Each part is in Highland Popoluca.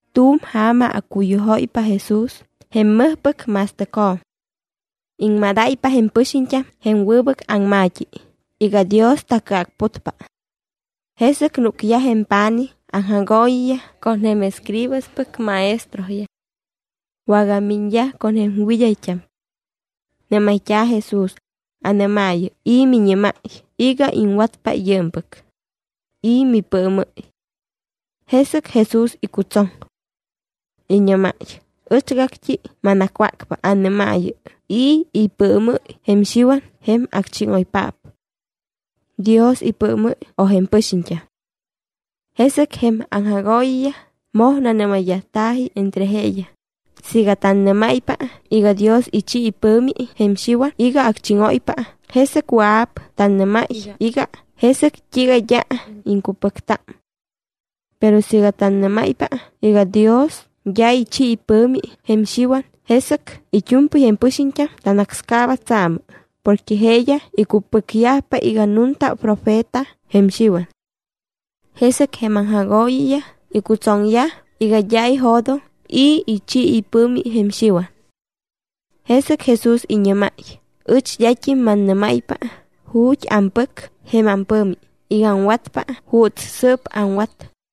Tu̱m ja̱ma accuyujóypa Jesús jém mɨjpɨc ma̱stɨcjo̱m. Iŋmadáypa jém pɨxiñt́am jém wɨbɨc aŋma̱t́i iga Dios tacɨacputpa. Jesɨc núcyaj jém pa̱nij aŋjagooyiyaj con jém escribaspɨc maestroyaj. Wagamiñyaj con jém wɨd́ayt́am. Nɨ́mayt́a̱ Jesús: —Anɨ́maayɨ: ¿I̱ miñɨ́máy iga iŋwatpa yɨɨmpɨc? ¿I̱ mipɨɨmɨ́y? Jesɨc Jesús icutsoŋ. Iñɨ́máy: —Ɨchgact́i manacwácpa. Anɨ́maayɨ: ¿I̱ ipɨɨmɨ́y jém Xiwan jém acchíŋoypaap? ¿Dios ipɨɨmɨ́y o jém pɨxiñt́am? Jesɨc jém aŋjagooyiyaj moj nanɨ́mayyajta̱ji entre jeeyaj: —Siiga tannɨ́máypa iga Dios ichi ipɨ̱mi jém Xiwan iga acchíŋóypa, jesɨc wɨa̱p tanɨ́máy iga: “¿Jesɨc t́iiga d́a iŋcupɨcta?” Pero siiga tannɨ́máypa iga Dios d́a ichi ipɨ̱mi jém Xiwan, jesɨc it́u̱mpɨy jém pɨxiñt́am tanácscaaba tsaamɨ porque jeeyaj icupɨcyajpa iga nunta profeta jém Xiwan. Jesɨc jém aŋjagooyiyaj icutsoŋyaj iga d́a ijo̱doŋ i̱ ichi ipɨ̱mi jém Xiwan. Jesɨc Jesús iñɨ́máy: —Ɨch d́at́im mannɨ́máypa ju̱t́ ampɨc jém ampɨ̱mi iga aŋwatpa juuts sɨ́p aŋwat.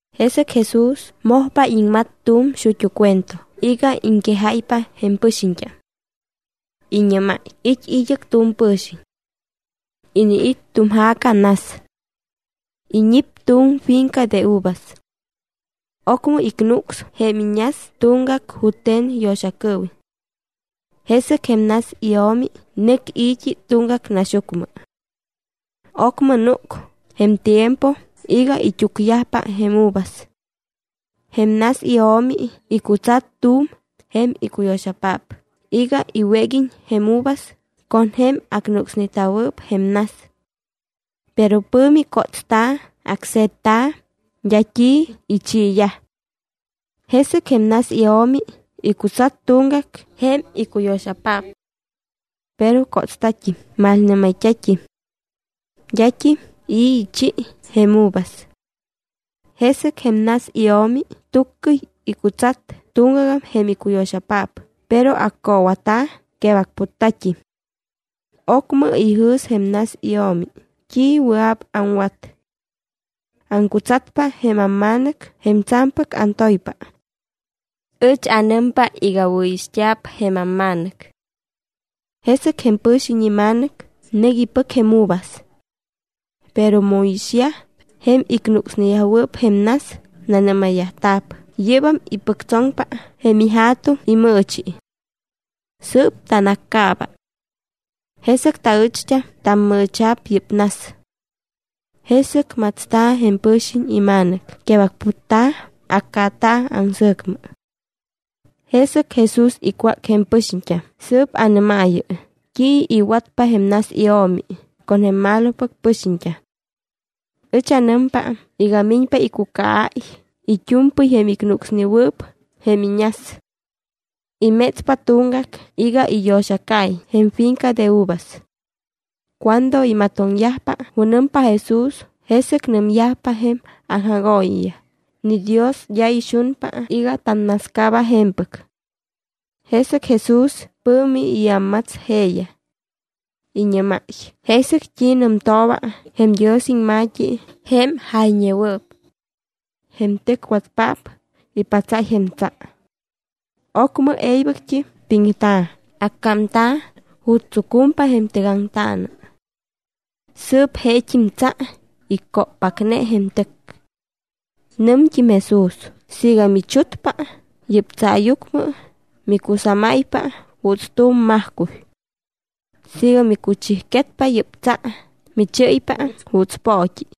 Jesɨc Jesús mojpa iŋmat tu̱m xut́u cuento iga iŋquejáypa jém pɨxiñt́am. Iñɨ́máy: —It́ id́ɨc tu̱m pɨ̱xiñ. Iniit́ tu̱m ja̱ca nas. Iñip tu̱m finca de uvas. Ocmɨ icnucs jém iñas tuŋgac jute̱n yo̱xacɨɨwiñ. Jesɨc jém nas io̱mi nɨc i̱t́i tuŋgac naxyucmɨ. Ocmɨ núc jém tiempo iga it́úcyajpa jém uvas. Jém nas io̱mi icutsat tu̱m jém icuyo̱xapaap iga iwéguiñ jém uvas con jém acnucsneta̱wɨɨp jém nas. Pero pɨ̱mi cótsta̱, acse̱tta̱, d́a t́i ichiiyaj. Jesɨc jém nas io̱mi icutsat tuŋgac jém icuyo̱xapaap. Pero cótsta̱t́im, malnɨ́mayt́a̱t́im. D́at́im i̱ ichi jém uvas. Jesɨc jém nas io̱mi tuccɨy icutsat tuŋgagam jém icuyo̱xapaap, pero accoowata̱, quebacputta̱t́im. ’Ocmɨ ijɨ̱s jém nas io̱mi: “¿T́i wɨa̱p aŋwat? Aŋcutsatpa jém amma̱nɨc jém tsa̱mpɨc antoypa. Ɨch anɨmpa iga wɨ̱ixt́a̱p jém amma̱nɨc.” Jesɨc jém pɨ̱xiñ ima̱nɨc nɨc ipɨc jém uvas. Pero mu iixyaj jém icnucsneyajwɨɨp jém nas, nanɨ́mayyajta̱p: “Yɨ́bam ipɨctsoŋpa jém ija̱tuŋ imɨɨchi. Sɨɨp tanaccaaba. Jesɨc taɨcht́am tammɨɨcha̱p yɨ́p nas.” Jesɨc matsta̱ jém pɨ̱xiñ ima̱nɨc, quebacputta̱, accaata̱ aŋsɨ̱cmɨ. Jesɨc Jesús icwác jém pɨxiñt́am: —Sɨɨp anɨ́maayɨ: ¿T́i iwatpa jém nas io̱mi con jém malopɨc pɨxiñt́am? Ɨch anɨmpa iga miñpa iccucaáy it́u̱mpɨy jém icnucsnewɨɨp jém iñas. Imétspa tuŋgac iga iyo̱xacaiñ jém finca de uvas. Cuando imatoŋyajpa junɨmpa Jesús, jesɨc nɨmyaj jém aŋjagooyiyaj: —¡Ni Dios d́a ixunpa iga tannascaaba je̱mpɨc! Jesɨc Jesús pɨ̱mi iámmats jeeyaj. Iñɨ́máy: —¿Jesɨc t́i nɨmtooba jém Dios iŋma̱t́i jém jayñewɨɨp? Jém tɨcwatpaap ipatsáy jém tsa. Ocmɨ e̱ybɨct́im piŋta̱, accámta̱ ju̱t́ tsucumpa jém tɨgaŋtaana. Sɨɨp jeet́im tsa icóppacne jém tɨc. Nɨmt́im Jesús: —Siiga michutpa yɨ́p tsaayucmɨ, micusámáypa juuts tu̱m majcuy. Siiga micuchijquetpa yɨ́p tsa, michɨ́ypa juuts poot́i.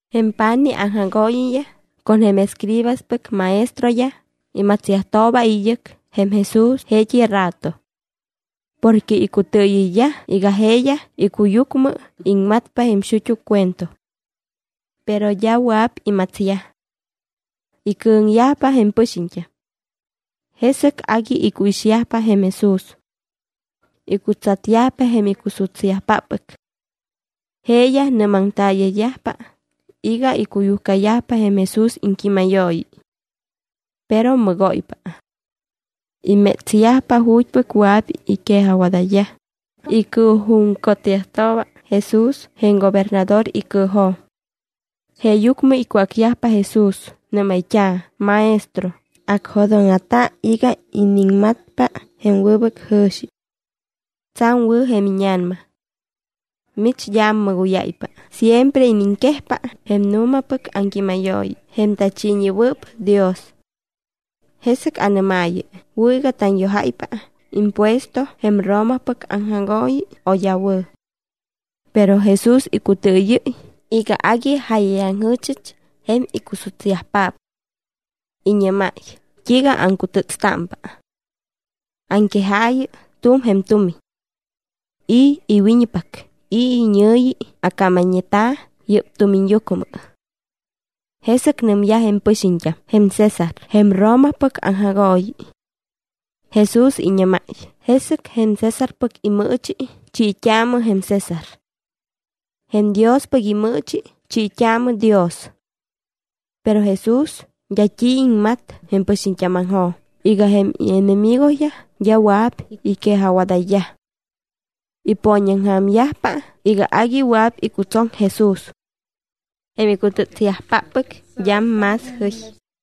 Jém pa̱nij aŋjagooyiyaj con jém escribaspɨc maestroyaj imatsyajtooba id́ɨc jém Jesús jeet́i rato. Porque icutɨɨyɨyyaj iga jeeyaj icuyucmɨ iŋmatpa jém xut́u cuento. Pero d́a wɨa̱p imatsyaj. Icɨ̱ŋyajpa jém pɨxiñt́am. Jesɨc agui icuixyajpa jém Jesús. Icutsatyajpa jém icusutsyajpáppɨc. Jeeyaj nɨ́maŋtaaya̱yajpa iga icuyujcayajpa jém Jesús iŋquímayooyi. Pero mɨgóypa. Imétsyajpa ju̱t́pɨc wɨa̱p iquejajwadayyaj, icɨɨjuŋcotyajtooba Jesús jém gobernador icɨɨjo̱m. Jeeyucmɨ icwácyajpa Jesús, nɨ́mayt́a̱: —Maestro, anjo̱dóŋa̱ta iga iniŋmatpa jém wɨbɨc jɨ̱xi. Tsa̱m wɨ̱ jém íña̱nama. Mich d́a ammɨgóyáypa, siempre iniŋquejpa jém nu̱mapɨc aŋquímayooyi jém tachiiñewɨɨp Dios. Jesɨc anɨ́maayɨ: ¿Wɨ̱ iga tanyojáypa impuesto jém Romapɨc aŋjagooyi o d́a wɨ̱? Pero Jesús icutɨɨyɨ́y iga agui jáyayaŋjɨ̱chɨch jém icusutsyajpaap. Iñɨ́máy: —¿T́iiga aŋcutɨtstámpa? Aŋquejaayɨ tu̱m jém tumiñ. ¿I̱ iwiñpac, i̱ iñɨ̱yi accámayñeta̱ yɨ́p tumiñyucmɨ? Jesɨc nɨmyaj jém pɨxiñt́am: —Jém César, jém Romapɨc aŋjagooyi. Jesús iñɨ́máy: —Jesɨc jém Césarpɨc imɨɨchi, chiit́aamɨ jém César. Jém Diospɨc imɨɨchi, chiit́aamɨ Dios. Pero Jesús d́a t́i iŋmat jém pɨxiñt́ámaŋjo̱m iga jém ienemigoyaj d́a wɨa̱p iquejajwadayyaj. Ipooñaŋja̱myajpa iga agui wɨa̱p icutsoŋ Jesús. Jém icutɨtsyajpáppɨc d́am más jɨy.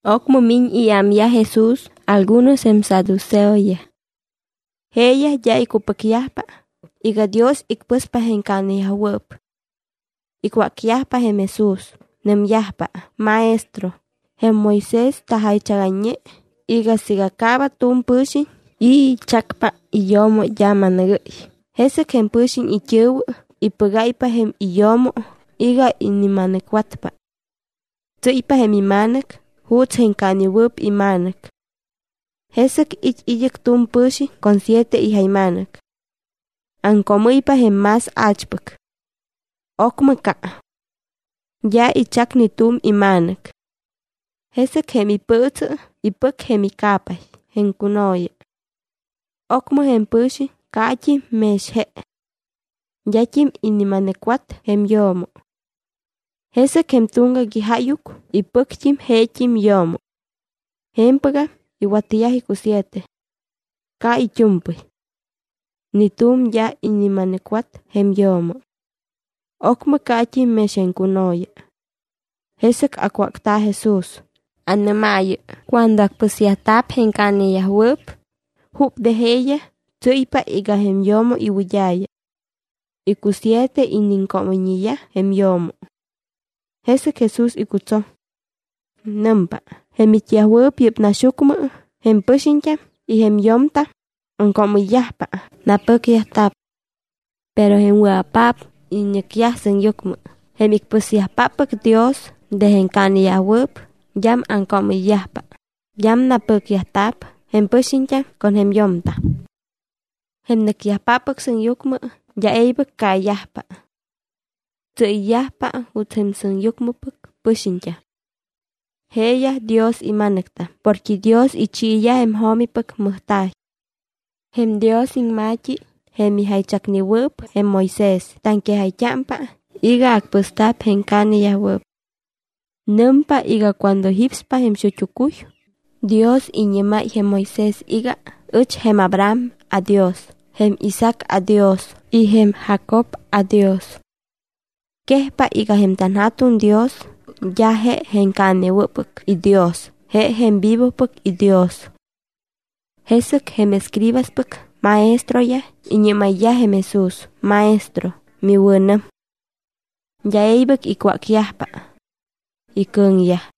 Ocmɨ miñ iámyaj Jesús algunos jém saduceoyaj. Jeeyaj d́a icupɨcyajpa iga Dios icpɨspa jém caaneyajwɨɨp. Icwácyajpa jém Jesús, nɨmyajpa: —Maestro, jém Moisés tajaychagayñe iga siiga caaba tu̱m pɨ̱xiñ y ichacpa iyo̱mo d́a ma̱nɨgɨ́y, jesɨc jém pɨ̱xiñ it́ɨ̱wɨ ipɨgáypa jém iyo̱mo iga inima̱nɨcwatpa. Tsɨ́ypa jém ima̱nɨc juuts jém caanewɨɨp ima̱nɨc. Jesɨc it́ id́ɨc tu̱m pɨ̱xiñ con siete ijayma̱nɨc. Aŋcoomɨ́ypa jém más a̱chpɨc. Ocmɨm ca. D́a ichac ni tu̱m ima̱nɨc. Jesɨc jém ipɨɨtsɨ ipɨc jém ica̱pay, jém cuno̱ya. Ocmɨ jém pɨ̱xiñ caat́im mex je. D́at́im inima̱nɨcwat jém yo̱mo. Jesɨc jém tuŋgac ijáyuc ipɨct́im jeet́im yo̱mo. Je̱mpɨgam iwatyaj icusiete. Ca it́u̱mpɨy. Ni tu̱m d́a inima̱nɨcwat jém yo̱mo. Ocmɨ caat́im mex jém cuno̱ya. Jesɨc acwácta̱ Jesús: —Anɨ́maayɨ cuando acpɨsyajta̱p jém caaneyajwɨɨp, ¿jup de jeeyaj tsɨ́ypa iga jém yo̱mo iwɨd́a̱ya? Icusiete iniŋcoomɨyñeyaj jém yo̱mo. Jesɨc Jesús icutsoŋ. Nɨmpa: —Jém it́yajwɨɨp yɨ́p naxyucmɨ jém pɨxiñt́am y jém yo̱mtam aŋcoomɨyyajpa, napɨcyajta̱p. Pero jém wɨa̱paap iñɨcyaj sɨŋyucmɨ, jém icpɨsyajpáppɨc Dios de jém caaneyajwɨɨp, d́am aŋcoomɨyyajpa, d́am napɨcyajta̱p jém pɨxiñt́am con jém yo̱mtam. Jém nɨ́cyajpáppɨc sɨŋyucmɨ d́a e̱ybɨc caayajpa. Tsɨ́yyajpa juuts jém sɨŋyucmɨpɨc pɨxiñt́am. Jeeyaj Dios ima̱nɨctam porque Dios ichiiyaj jém jo̱mipɨc mɨjta̱y. Jém Dios iŋma̱t́i, jém ijaychacnewɨɨp jém Moisés, taŋquejayt́ámpa iga acpɨsta̱p jém caaneyajwɨɨp. Nɨmpa iga cuando jípspa jém xut́u cuy, Dios iñɨ́máy jém Moisés iga: “Ɨch jém Abraham aDios, jém Isaac aDios y jém Jacob aDios.” Quejpa iga tanJa̱tuŋ Dios d́a je jém caanewɨ́ppɨc iDios, je jém vivopɨc iDios. Jesɨc jém escribaspɨc maestroyaj iñɨ́mayyaj jém Jesús: —Maestro, miwɨ̱nɨm. D́a e̱ybɨc icwácyajpa. Icɨ̱ŋyaj.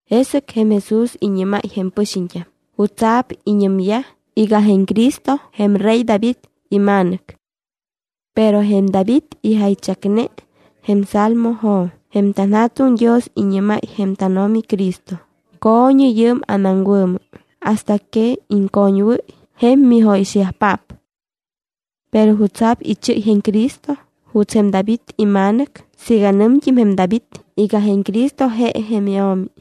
Jesɨc jém Jesús iñɨ́máy jém pɨxiñt́am: —¿Jutsa̱p iñɨmyaj iga jém Cristo jém rey David ima̱nɨc? Pero jém David ijaychacne jém Salmojo̱m: Jém tanJa̱tuŋ Dios iñɨ́máy jém tánO̱mi Cristo: “Co̱ñɨ yɨɨm anaŋwɨ̱mɨ hasta que iŋcoñwɨ́y jém mijóyixyajpaap.” ’¿Pero jutsa̱p ichɨ́y jém Cristo juuts jém David ima̱nɨc siiga nɨmt́im jém David iga jém Cristo je jém iO̱mi?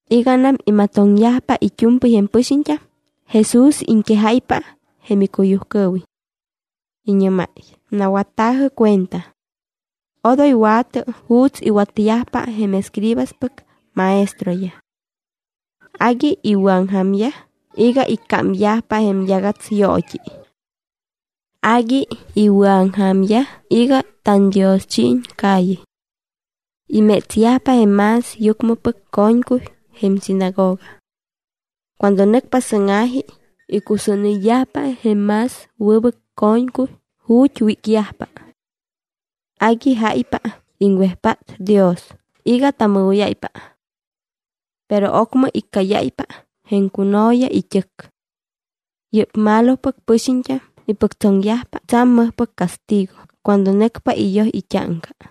Iganam imatoŋyajpa it́u̱mpɨy jém pɨxiñt́am, Jesús iŋquejáypa jém icuyujcɨɨwiñ. Iñɨ́máy: —¡Nawatta̱jɨ cuenta! Odoy wa̱tɨ juuts iwatyajpa jém escribaspɨc maestroyaj. Agui iwɨ̱aŋja̱myaj iga iccámyajpa jém yagatsyoot́i. Agui iwɨ̱aŋja̱myaj iga tandioschiiñ calle. Imétsyajpa jém más yucmɨpɨc co̱ñcuy jém sinagoga. Cuando nɨcpa sɨ́ŋa̱ji icusúnɨyyajpa jém más wɨbɨc co̱ñcuy ju̱t́ wícyajpa. Agui jáypa iŋwejpát Dios iga tamɨgóyáypa. Pero ocmɨ iccáyáypa jém cuno̱ya it́ɨc. Yɨ́p malopɨc pɨxiñt́am ipɨctsoŋyajpa tsa̱m mɨjpɨc castigo cuando nɨcpa iyoj it́áŋca.